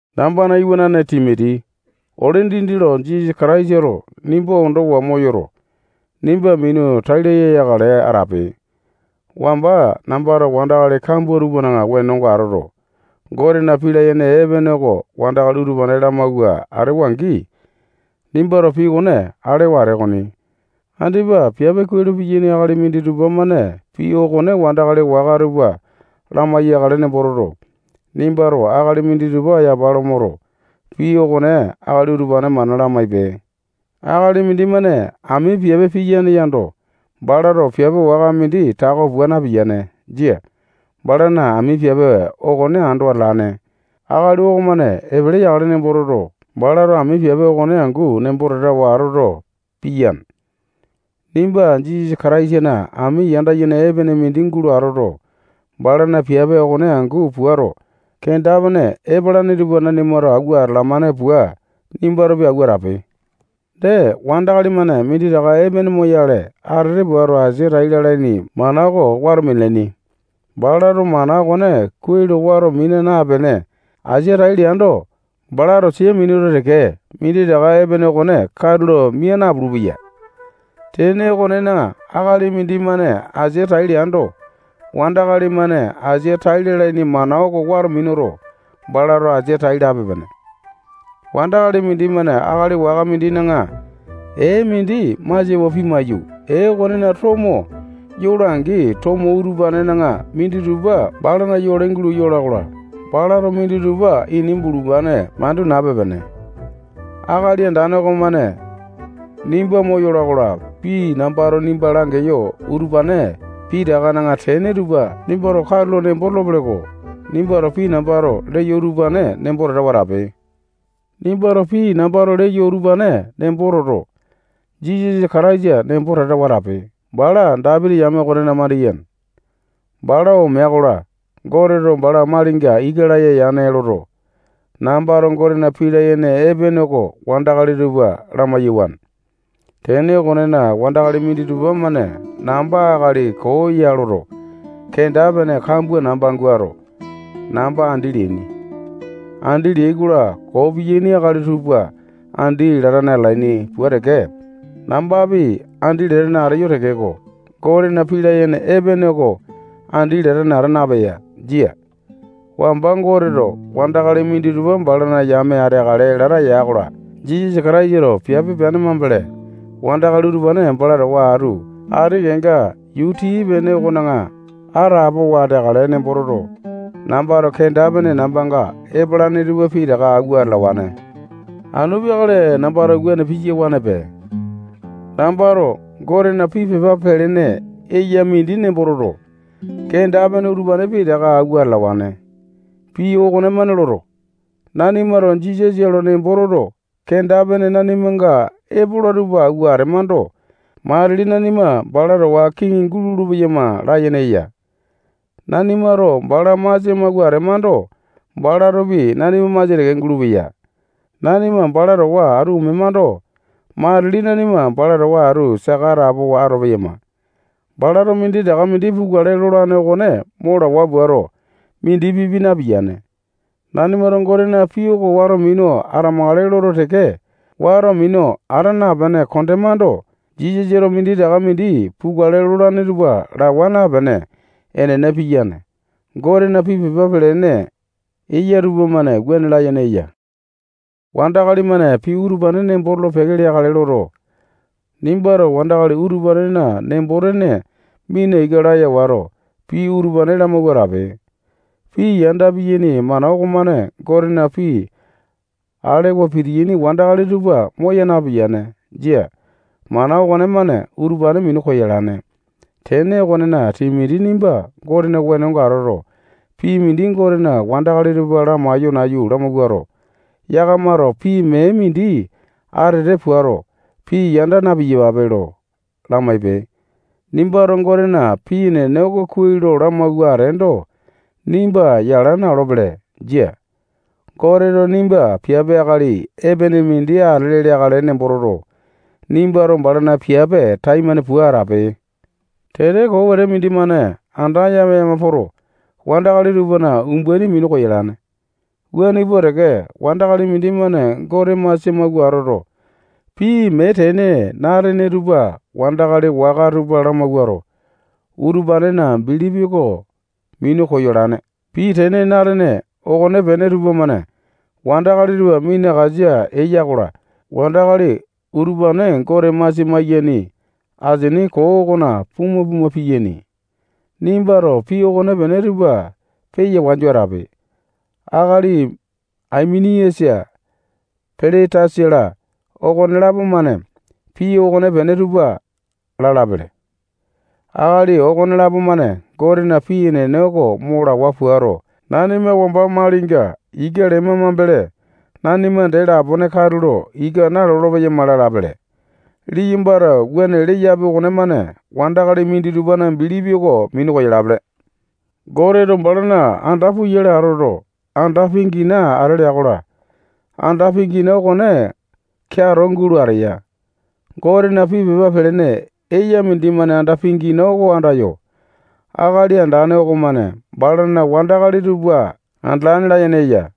Nambana iwanane Timoti, ole dindi lo Jisasa Kataisato nimba ondowa moyoto, nimba minu tai laya yakale atape. Wamba nambato wandakali kambua tupana wenonga atoto, Gotena pii layene epene oko wandakali utupane lamawua atewa-angi, nimbato pii okone alewa atee okoni. Andipa piape kuai lo piyaini akali minditupa-mane pii okone wandakali waka tupa lamai-yakale nembo toto, nimbato akali minditupa yapa lo moto, pii okone akali utupane mana lamaipe. Akali mindimane ami piape piyane yando, balato piape waka mindi tako pua napiyane. Jia. Balana ami piape okone ando atalane akali okomane epele yakale nembo toto, balato ami piape okone angu nembo tatawa atoto, piyane. Nimba Jisasa Kataisana ami yanda yene epene mindi gulo atoto, balana piape okone angu puato, kenda-pene epalane tupa nanimato awua atalamane pua, nimbatopi awua atape. Dee, wandakali-mane minditaka epene moyale atete puato, asia tai lalaini mana oko wato minalane. Balato mana okone kuai lo wato mina napene, asia tai leando, balato sia minuto teke, minditaka epene okone katulo mia napulu-peya. Tene okonena, akali mindimane asia tai leando, wandakali-mane asia tai lalaini mana oko wato minuto, balato asia tai lape-pene. Akali mindimane akali waka mindina ee mindi masiawa pimaiyu, ee okonena tomo yola-angi, tomo utupanena minditupa balana yole gulo yola-kola, balato minditupa ini bulupane mandu nape-pene. Akali Andane okomane nimba moyola-kola, pii nambato nimba langeyo utupane pitakana tene tupa nimbato katulo nembo tolopele-ko. Nimbato pii nambato leyo utupane nembo tatawa atape. Nimbato pii nambato leyo utupane nembo toto, Jisasa Kataisa nembo tatawa atape. Bala Dapiti yame okonena mandiyene. Bala omea-kola, Goteto bala malinga ika laya yane loto, nambato Gotena pii layene epene oko wandakali tupa lamai-yawane. Tene okonena, wandakali minditupa-mane namba akali koo ya loto, kenda-pene kambua namba guato, namba andi leaini. Andi leai-kola, koo piyaini akali tupa andi latane atalaini pua teke, nambapi andi latane ateyo tekeko, Gotena pii layene epene oko andi latane ata napeya. Jia. Wamba Goteto wandakali minditupa balana yame ateakale lata ya-kola, Jisasa Kataisato piape peane mambele, wandakali utupane bala towa atu ati kenga yuu tii-pene okona atapowa ateakale nembo toto, nambato kenda-pene nambanga epalane tupa pitaka awua atalawane. Anu peakale nambato wuane piyawanepe. Nambato Gotena pii pepa pelene eya mindi nembo toto, kenda-pene utupane pitaka awua atalawane. Pii okonemane loto, nanimato Jisasa lo nembo toto, kenda-pene nanimanga epola tupa awua atemando, matili nanima bala towa atu kiŋi gulolo-peyama layene eya. Nanimato bala masia mawua atemando, balatopi nanima masia teke gulupeya. Nanima bala towa atu omemando, matili nanima bala towa atu saka atapowa atolo-peyama. Balato minditaka mindi pukale lolane okone mo lawa puato, mindi pipi napiyane. Nanimato Gotena pii oko wato minu atamakale loto teke, wato minu ata napene kondemando, Jisasato minditaka mindi pukale lolane tupa lawa napene, enene piyane. Gotena pii pepa pelene eya tupamane wuane layene eya. Wandakali-mane pii utupane nembo tolo-peke leakale loto, nimbato wandakali utupanena nembo-tene mina ika laya wato, pii utupane lamawua atape. Pii yanda piyaini mana okomane Gotena pii alewa pitiyaini wandakali tupa moya napiyane. Jia. Mana okonemane utupane minu koyalane. Tene okonena, Timoti nimba Gotena wenonga atoto, pii mindi Gotena wandakali tupa lamaiyo nayu lamawuato, yakamato pii mee mindi atete puato, pii yanda na-piyapape lo lamaipe. Nimbato Gotena pii enene oko kuai lo lamawua ateendo, nimba yala na-olopele. Jia. Goteto nimba piape akali epene mindi atele leakale nembo toto, nimbato balana piape taimane pua atape. Tete koo wete mindimane anda yama-yama poto, wandakali tupana umbaini minu yolane. Wuane pua teke, wandakali mindimane Gote masia mawua atoto, pii mee tene na-atene tupa wandakali waka tupa lamawuato, utupanena bilipi oko minu koyalane. Pii tene na-atene okonepene tupamane wandakali tupa minakasa eya-kola, wandakali utupane Gote masia maiyaini asini koo okona puma-puma piyaini. Nimbato pii okonepene tupa peya wanju atape. Akali Aimeniasa, Piletasa-la, okonelapo-mane pii okonepene tupa lalapele. Akali okonelapo-mane Gotena pii enene oko mo lawa puato, nanima wamba malinga ika lema mambele, nanima dee lapone katulo ika nalolo-peyama lalapele. Liyambato wuane leapi okonemane wandakali minditupana bilipi oko minu koyalapele. Goteto balana anda puyale atoto, anda pingina ate lea-kola, anda pingina okone keato gulo ateya. Gotena pii pepa pelene eya mindimane anda pingina oko andayo, Akali Andane okomane balana wandakali tupa andalane layene eya.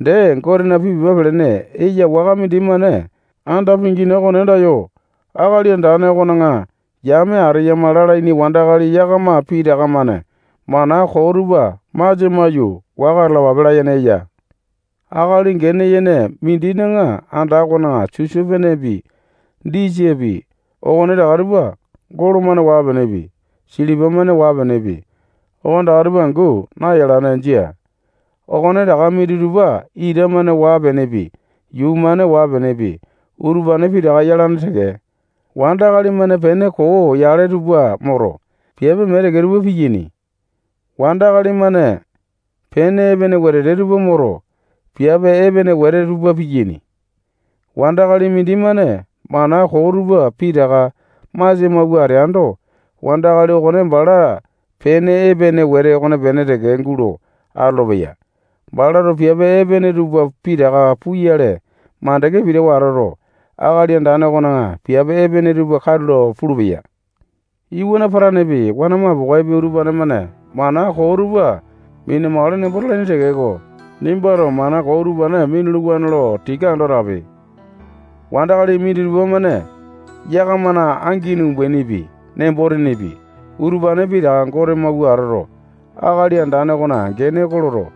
Dee, Gotena pii pepa pelene eya waka mindimane anda pingina okone andayo, Akali Andane okona yame ateyama lalaini wandakali yakama pitaka-mane mana koo tupa masia maiyu, waka atalapape layene eya. Akali gene yene mindina anda okona sisopenepi, disapi, okonetaka tupa golo-mane waa-penepi, silipa-mane waa-penepi, okonetaka tupa angu nayalane. Jia. Okonetaka minditupa ita-mane waa-penepi, yuu-mane waa-penepi, utupane pitaka yalane teke. Wandakali-mane pene koo yale tupa moto, piape mee teke tupa piyaini. Wandakali-mane pene epene wete tupa moto, piape epene wete tupa piyaini. Wandakali mindimane mana koo tupa pitaka masia mawua ateando, wandakali okone bala pene epene wete okonepene teke gulo atolopeya. Balato piape epene tupa pitaka puyale mandeke pitawa atoto, Akali Andane okona piape epene tupa katulo pulupeya. Iwana patanepi, wana mapokaepi, utupane-mane mana koo tupa mina-makale nembo talaini tekeko, nimbato mana koo utupane minuluwane. Tika ando atape. Wandakali minditupa-mane yakamana angini umbainipi, nembo-tenepi, utupane pitaka Gote mawua atoto, Akali Andane okona gene oko loto,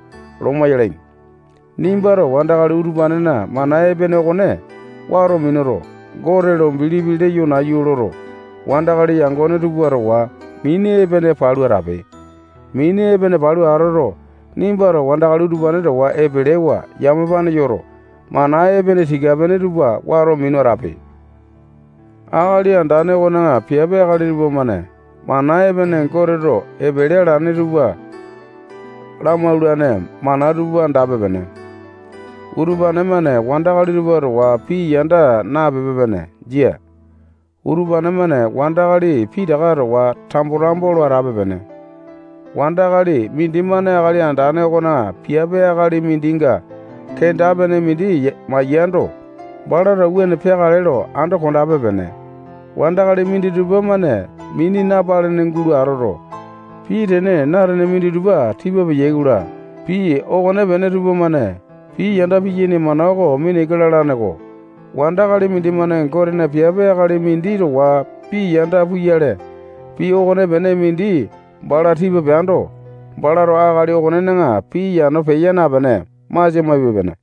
loma yalaini. Nimbato wandakali utupanena mana epene okone wato minuto, Gote lo bilipi leyo nayu loto, wandakali yangone tupa towa mini epene palu atape. Mini epene palu atoto, nimbato wandakali utupane towa epelewa yamapane yoto, mana epene tika-pene tupa wato minu atape. Akali Andane okona piape akali tupamane mana epene Goteto epele alane tupa lamaulane mana tupa andape-pene. Utupane-mane wandakali tupa towa pii yanda napepe-pene. Jia. Utupane-mane wandakali pitaka towa tambo-tambo lo atape-pene. Wandakali mindimane Akali Andane okona piape akali mindinga kenda-pene mindi maiyando, balato wuane peakale lo ando kondape-pene. Wandakali minditupa-mane mini napalene gulo atoto, pii tene na-atene minditupa tipa peyai-kola, pii okonepene tupamane pii yanda piyaini mana oko mina ika lalane-ko. Wandakali mindimane Gotena piape akali mindi towa pii yanda puyale, pii okonepene mindi bala tipa peando, balato akali okonena pii yano peya napene, masia maipe-pene.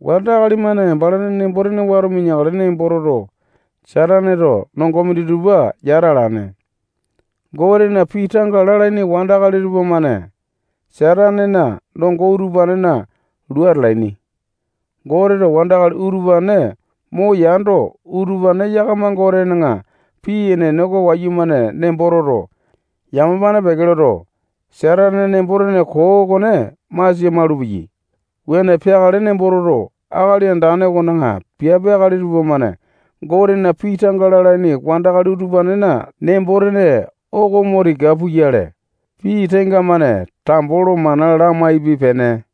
Wandakali-mane balana nembo-tene wato mineakale nembo toto, Sataneto nongo minditupa yata alane. Gotena pii tanga lalaini wandakali tupamane Satanena nongo utupanena lua atalaini. Goteto wandakali utupane moyando, utupane yakama Gotena pii enene oko wayumane nembo toto, yamapane peke loto, Satanena nembo-tene koo okone masia malupeyai. Wuane peakale nembo toto, Akali Andane okona piape akali tupamane Gotena pii tanga lalaini wandakali utupanena nembo-tene oko mo tika puyale, pii tenga-mane tambo lo mana lamaipe-pene.